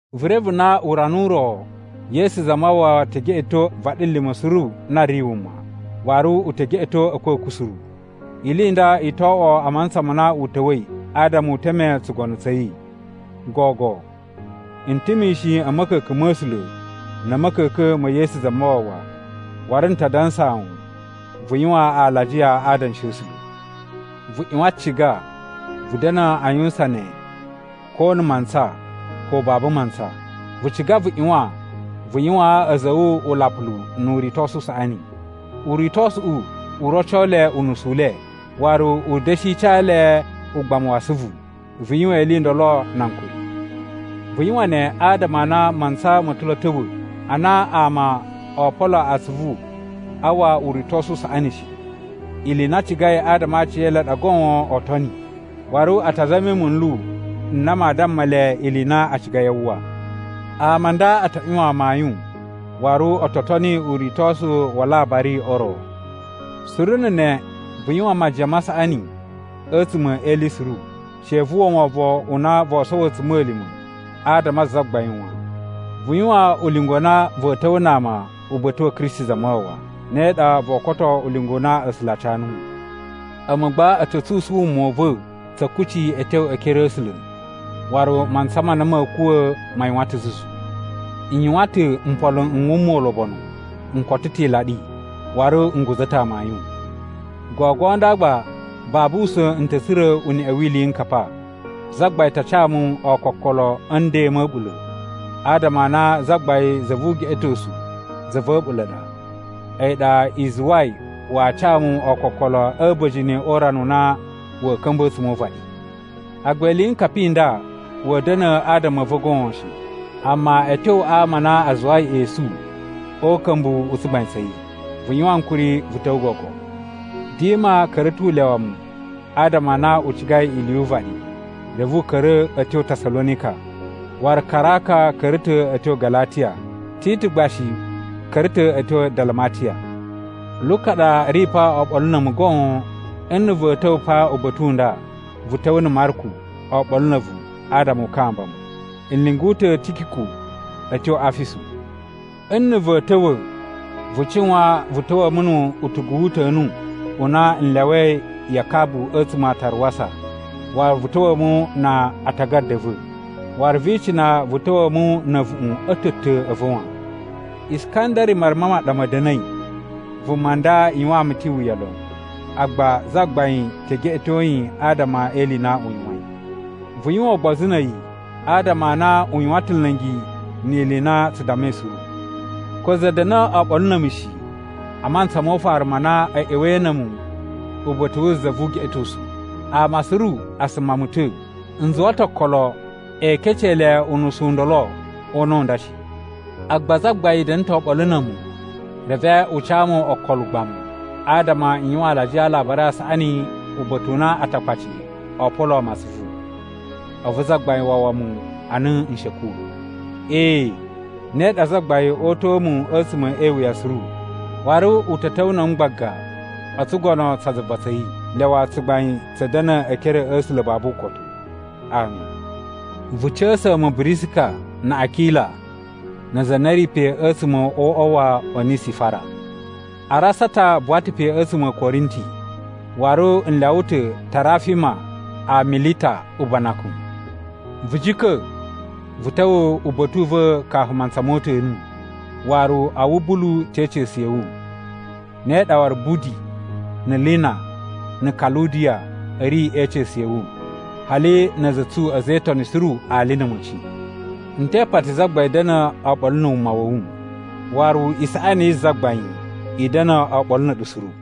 Vu reve na urana u ro Yesu Zamawawa te geꞌeto vaɗilima̱ suru na ri wuma, waru u te geꞌeto a̱kwa̱kwa̱ suru. Ili i nda i to oꞌwo a mantsa ma na u ta̱wa̱i adama u teme tsugono tsa̱ yi. Gogo, n ta̱ mishin a̱ ma̱ka̱ka̱n ma̱ A̱sula̱ na̱ a̱ ma̱ka̱ka̱n ma̱ Yesu Zamawawa, waru n ta dansaa wu vu yuwan alajiya a adanshi a̱ A̱sula̱. Vu ꞌyuwan ciga vu da̱na̱ a yuwusan ne ko na̱ mantsa, ko babu mantsa. Vu ciga vu ꞌyuwan vu yuwaan a̱za̱ a̱ wu ulapulu nu uritosu u saꞌani. Uritosuꞌu u roco le unusu u le, waru u da̱shi ca le ugbamu wa asuvu. Vu yuwan ili i ndolo na ankuri. Vu yuwan ne adama a na mantsa ma̱ ta̱ lo a̱ ta̱wa̱ a na ama oo polo atsuvu a uwwa uritosu u saꞌani shi. Ili i na a cigai adama a aciyele a ɗa goon oo toni, waru a ta zami munlu n na maa damma le ili i na a cigai a uwwa. Ama a nda a ta ꞌyuwan amayun, waru o to toni uritosu wa alabari o ro. Suru na̱ ne vu yuwan majiyan ma saꞌani a̱tsuma̱ e ili suru. She vu uwwa wovon u na voo sowo a̱tsuma̱lima̱ adama a Zagbain wan. Vu yuwan ulinga u na va̱a̱ ta̱wa̱a̱ na ama uba̱ta̱ wa̱ Kristi Zamawawa, ne ɗa voo koto ulinga u na A̱sula̱ a ca nuwu. A̱mu gba a̱ ta̱ tsusun wuma u va̱ tsa̱ kucci a̱ tyo e ekere a̱ A̱sula̱. Waru mantsa ma na ma̱a̱ kuwa̱ ma yuwan ta̱ zuzu. N yuwan ta̱ mpolo n wuma ulobonu, n koto ta̱ ilaɗi, waru n guza̱ ta̱ amayun. Gogo nda gba babu usa̱n n ta̱ tsura̱ uneꞌe wi iliyinkapa. Zagbain ta ca mu ookokolo a̱ nden ma̱ a̱ɓula̱. Adama a na Zagbain za vu ugeꞌetosu za va̱ a̱ɓula̱ ɗa, a̱yi ɗa i zuwai waa ca mu ookokolo a̱ a̱ba̱jini o urana u na wa̱a̱ ka̱mba̱ a̱tsuma̱ o uvaɗi. Agba iliyinkapa i nda wa̱a̱ da̱na̱ adama a̱ va̱ goon shi, amma a̱ tyo a ama a na a zuwai esu o uka̱mbu u tsugbain tsa̱ yi. Vu yuwan ankuri vu ta̱wa̱ gogo. Dima ka̱ra̱ ta̱ u lyawa mu adama a na u cigai ili yu uvaɗi. Reve u ka̱ra̱ a̱ tyo Tasalonika. Waru Karaka ka̱ra̱ ta̱ a̱ tyo Galatiya, Titu gba shi ka̱ra̱ ta̱ a̱ tyo Dalamatiya. Luka ɗa ri pa oɓolo na̱ a̱mu goon. Nna̱ va̱a̱ ta̱wa̱ pa uba̱ta̱ u nda, vu ta̱wa̱ na̱ Marku oɓolo na̱ a̱vu adama u kamba mu. N lyungu ta̱ Tikiku a̱ tyo Afisu. Nna̱ va̱a̱ ta̱wa̱, vu cuwan vu ta̱wa̱a̱ mu nu utugu wu uta̱nu u na n lyawai ya Kabu a̱tsuma̱ a Taruwasa. Waru vu ta̱wa̱a̱ mu na atagada a̱ va̱, waru vi icina vu ta̱wa̱a̱ mu na̱ a̱vuꞌun a̱ ta̱ a̱ ta̱ a̱ va̱ wan. Iskandari maruma ma ɗa ma̱ da̱na̱i. Vuma nda yuwaan mu ta̱ iwuya lon, agba Zagbain te geꞌeto yi adama e ili i na u yuwain. Vu yuwan ugbozu na̱ a̱yi, adama a na u yuwan ta̱ nla̱ngi ni ili i na tsu dammai suru. Ko za da̱na̱ oɓolo na̱ a̱mu shi a mantsa mo ufaru ma na a̱ ꞌya̱wa̱i na̱ a̱mu uba̱ta̱ wu za vu ugeꞌetosu. Ama suru a suma mu ta̱. N zuwa ta̱ okolo ee kecee le unusu u ndolo o una̱ u nda shi. Agba Zagbain da̱na̱ ta̱ oɓolo na̱ a̱mu, reve u ca mu okolo ugbamu, adama n yuwan alajiya a Alabari a Saꞌani uba̱ta̱ u na Atakpaci oo poloo mu atsuvu. A̱vu Zagbain wawa mu a na n shi a̱ kuwa̱. Ee, ne ɗa Zagbain oo uta̱a̱ mu a̱tsuma̱ e iwuya suru, waru u ta̱ ta̱wa̱ na̱ a̱mu gbaga o tsugono tsa zuva tsa̱ yi. Lyawa tsugbain tsa̱ da̱na̱ e ekere a̱ A̱sula̱ babu ukotu. Ami. Vu ca̱sa̱a̱ mu Birisika na̱ Akila na aza a na a̱ ri pe a̱tsuma̱ o uꞌwa wa Onisifara. Arasata buwa ta̱ pe a̱tsuma̱ a̱ Korinti. Waru n lyawa ta̱ Tarafima a Milita ubanakun. Vu jika̱, vu ta̱wa̱ uba̱ta̱ u va̱ kafu mantsa mo uta̱nu. Waru Awubulu te ica̱su ya̱ wu, ne ɗa waru Budi na̱ Lina na̱ Kaludiya a̱ ri e ica̱su ya̱ wu, hali na̱ a̱za̱ a̱ tsu a̱za̱ e Itoni suru ali na̱ a̱ma̱ci. N te ipati Zagbain da̱na̱ oɓolo na̱ wuma wa̱ wu. Waru isaꞌani yi Zagbain i da̱na̱ oɓolo na̱ a̱ɗu suru.